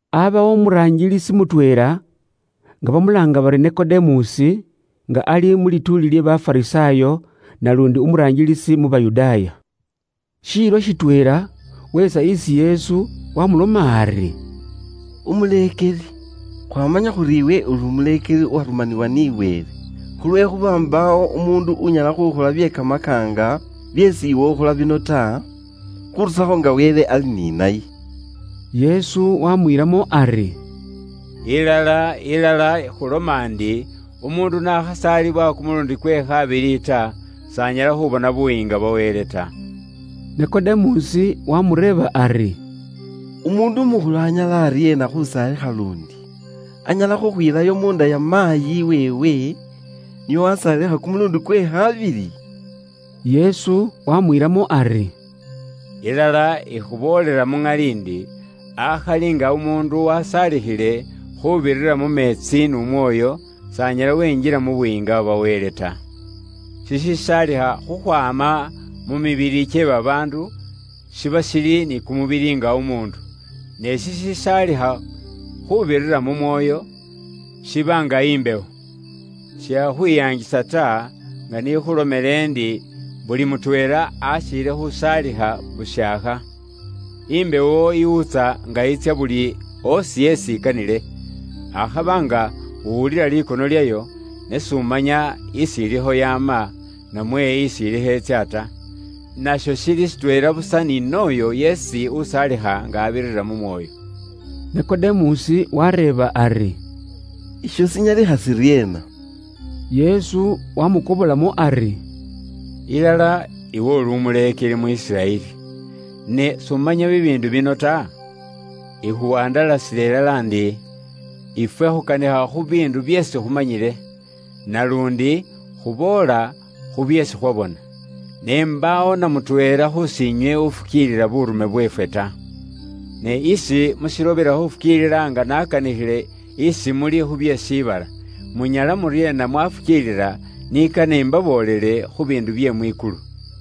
Aabawo umuraangilisi mutweela, nga bamulaanga bari Nikodemusi, nga ali mu lituuli lye Bafarisaayo naluundi umuraangilisi mu Bayudaaya. Shiilo shitweela weetsa isi Yesu, waamuloma ari, “Umuleekeli, khwaamanya khuri iwe umuleekeli uwarumaniwa ni Wele. Khulwekhuuba mbaawo umuundu unyala khuukhola bye kamakaanga byeesi iwe ukhola bino ta, khuurusakho nga Wele ali ni naye.” Yesu wamwiilamo ari, “Ilala, ilala, ikhuloma ndi umuundu n'akhasaalibwa kumuluundi kwe khaabili ta, s'anyala khubona Buyiinga bwa Wele ta.” Nikodemusi waamureeba ari, “Umuundu umukhulu anyala aryeena khusaalikha luundi? Anyala khukhwiilayo munda ya maayi weewe nio wasaalikha kumuluundi kwe khabili?” Yesu waamwiilamo ari, “Ilala ikhuboolela muŋali ndi, akhali nga umuundu wasaalikhile khuubirira mu meetsi n'Umwoyo, s'anyala wenjila mu Buyiinga bwa Wele ta. Shishisaalikha khukhwaama mu mibili kye babaandu, shiba shili ni kumubili nga umuundu, ne shishisaalikha khuubirira mu Mwoyo, shiba nga imbewo. Shikhakhwiyaangisa ta nga ise n'ikhulomeele iwe ndi, ‘Buli mutweela akhiile khuusaalikha bushaakha.’ Imbewo iwuutsa nga itsya buli oosi isi ikanile. Akhaba nga uwulila likono lyayo, ne s'umanya isi ilikho yaama, namwe isi ilikho itsya ta. Nasho shili shitweela busa ni n'oyo yeesi usaalikha nga abirira mu Mwoyo.” Nikodemusi waareeba ari, “Isho shinyalikha shiryeena?” Yesu waamukobolamo ari, “Ilala, iwe uli umuleekeli mu Isiraeli, ne s'umanya bibiindu bino ta? Ikhuwandalasila ilala ndi, ifwe khukanikha khu biindu byeesi khumanyile. Naluundi khuboola khu byeesi khwabona. Ne mbaawo namutweela khusiinywe ufukiilila buurume bweefwe ta. Ne isi mushilobela khufukiilila nga nakanikhile isi muli khu bye mu shiibala, munyala muryeena mwafukiilila ni kane imbaboolele khu biindu bye mwikulu?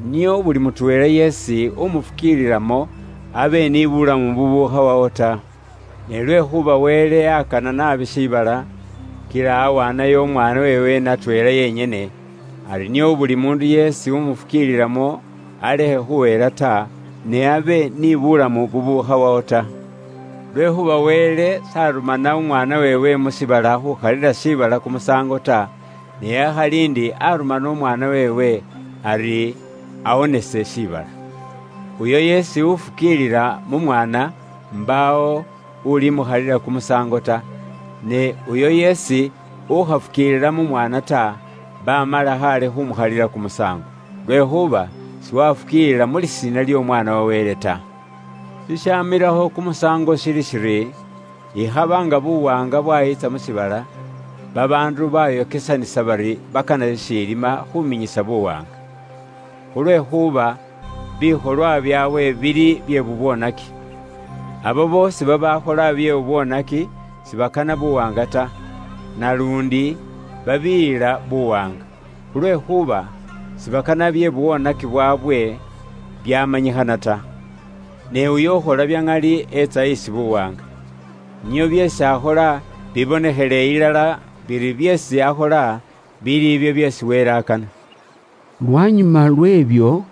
Nio buli mutweela yeesi umufukiililamo abe ni bulamu bubukhawawo ta. “Ne lwekhuuba Wele akana naabi shiibala, kila awaanayo umwaana weewe natweela yenyene, ari nio buli muundu yeesi umufukiililamo alekhe khuhela ta, ne abe ni bulamu bubukhawawo ta. Lwekhuuba Wele s'arumana Umwaana weewe mu shiibala khukhalila shiibala kumusaango ta, ne akhali ndi arumana Umwaana weewe ari awonese shiibala. Uyo yeesi ufukiilila mu Mwaana mbaawo ulimukhalila kumusaango ta; ne uyo yeesi ukhafukiilila mu Mwaana ta, baamala khaale khumukhalila kumusaango. Lwekhuuba siwafukiilila mu lisiina ly'Omwaana wa Wele ta. “Shishaamilakho kumusaango shili shiri: ikhaba nga buwaanga bwayitsa mu shiibala, babaandu baayokesanisa bari bakana shishiilima khuuminyisa buwaanga. Khulwekhuuba bikholwa byaabwe bili bye bubwoonaki. Abo boosi babaakhola bye bubwoonaki sibakana buwaanga ta, naluundi babiiyila buwaanga, khulwekhuuba sibakana bye bubwoonaki byaabwe byamanyikhana ta. Ne uyo ukhola bya ŋali, eetsa isi buwaanga, nio byeesi akhola bibonekhele ilala biri byeesi akhola bili ibyo byeesi Wele akana.” Lwanyuma lwe'byo,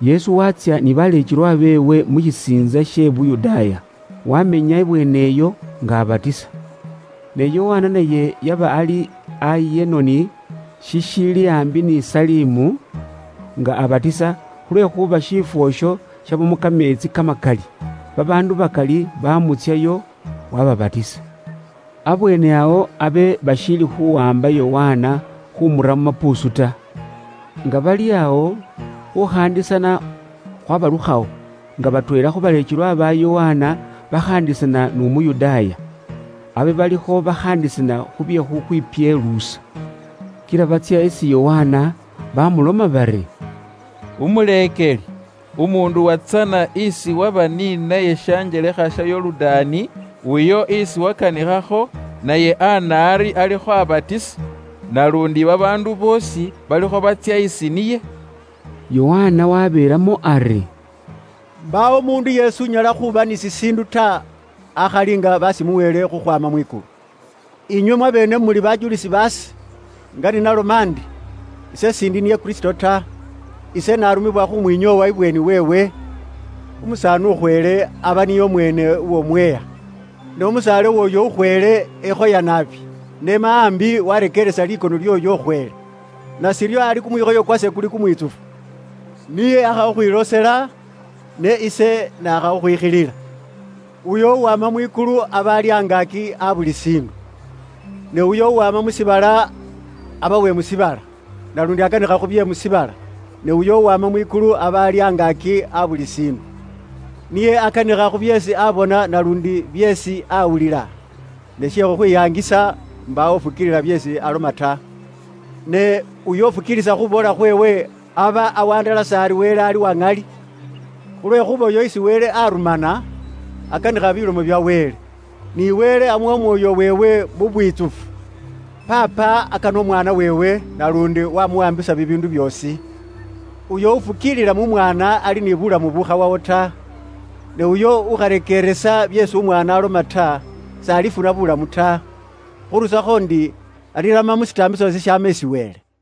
Yesu waatsya ni baleekelwa beewe mu shisiintsa she Yuda. Waamenya ibweene iyo, nga abatisa. Ne Yokana naye yaba ali i Ayenoni, shishiili aambi ni Salimu, nga abatisa, khulwekhuuba shiifwo isho shabamo kameetsi kamakali. Babaandu bakali baamutsyayo, waababatisa. Abweene awo abe bashiili khuwaamba Yokana khumura mu mapuusu ta. Nga bali awo, khukhaandisana khwabalukhwawo, nga batweela khu baleekelwa ba Yokana bakhaandisana n'Umuyudaaya. Abe balikho bakhaandisana khu bye khukhwipyeluusa. Kila batsya isi Yokana bamuloma bari, “Umuleekeli, umuundu uwatsana isi waba ni naye shanjelekha sha Yorudaani, uyo isi wakanikhakho, naye ana ari alikho abatisa. Naluundi babaandu boosi balikho batsya isi niye.” Yokana wabeelamo ari, “Mbaawo umuundu yeesi unyala khuuba ni shishiindu ta, akhali nga bashimuweele khukhwaama mwikulu. Inywe mwabeene muli bajulisi baase, nga ni naloma ndi, ise s'indi niye Kristo ta. Ise narumanibwa khumwinyoowa ibweeni weewe. Umusaani ukhweele, aba niye umweene uw'omweha. Ne umusaale w'oyo ukhweele ekhoya naabi, n'ema ambi warekeeresa likono lyooyo ukhweele. Nashiryo ari kumwikhoyo kwase kuli kumwitsufu. Niye aakha khukhwiloosela, ne ise naakha khukhwikhilila.” Uyo uwaama mwikulu aba ali angaaki a buli shiindu; ne uyo uwaama mu shiibala aba uwe mu shiibala, naluundi akanikha khu bye mu shiibala. Ne uyo uwama mwikulu aba ali angaaki a buli shiindu. Niye akanikha khu byeesi aabona naluundi byeesi aawulila, ne she khukhwiyaangisa, mbaawo ufukiilisa byeesi aloma ta. Ne uyo ufukiilisa khuuboola khweewe, aba awandalasa ari Wele ali uwa ŋali. Khulwekhuuba uyo isi Wele arumana, akanikha bilomo bya Wele, ni Wele aamuwa Umwoyo weewe mu bwitsufu. Paapa akana umwaana weewe, naluundi waamuwaambisa bibiindu byoosi. Uyo ufukiilila mu mwaana ali ni buulamu bubukhawawo ta. Ne uyo ukharekeeresa byeesi Umwaana aloma ta, s'alifuna buulamu ta. Khuurusakho ndi, alirama mu shitaambiso shishaama isi Wele.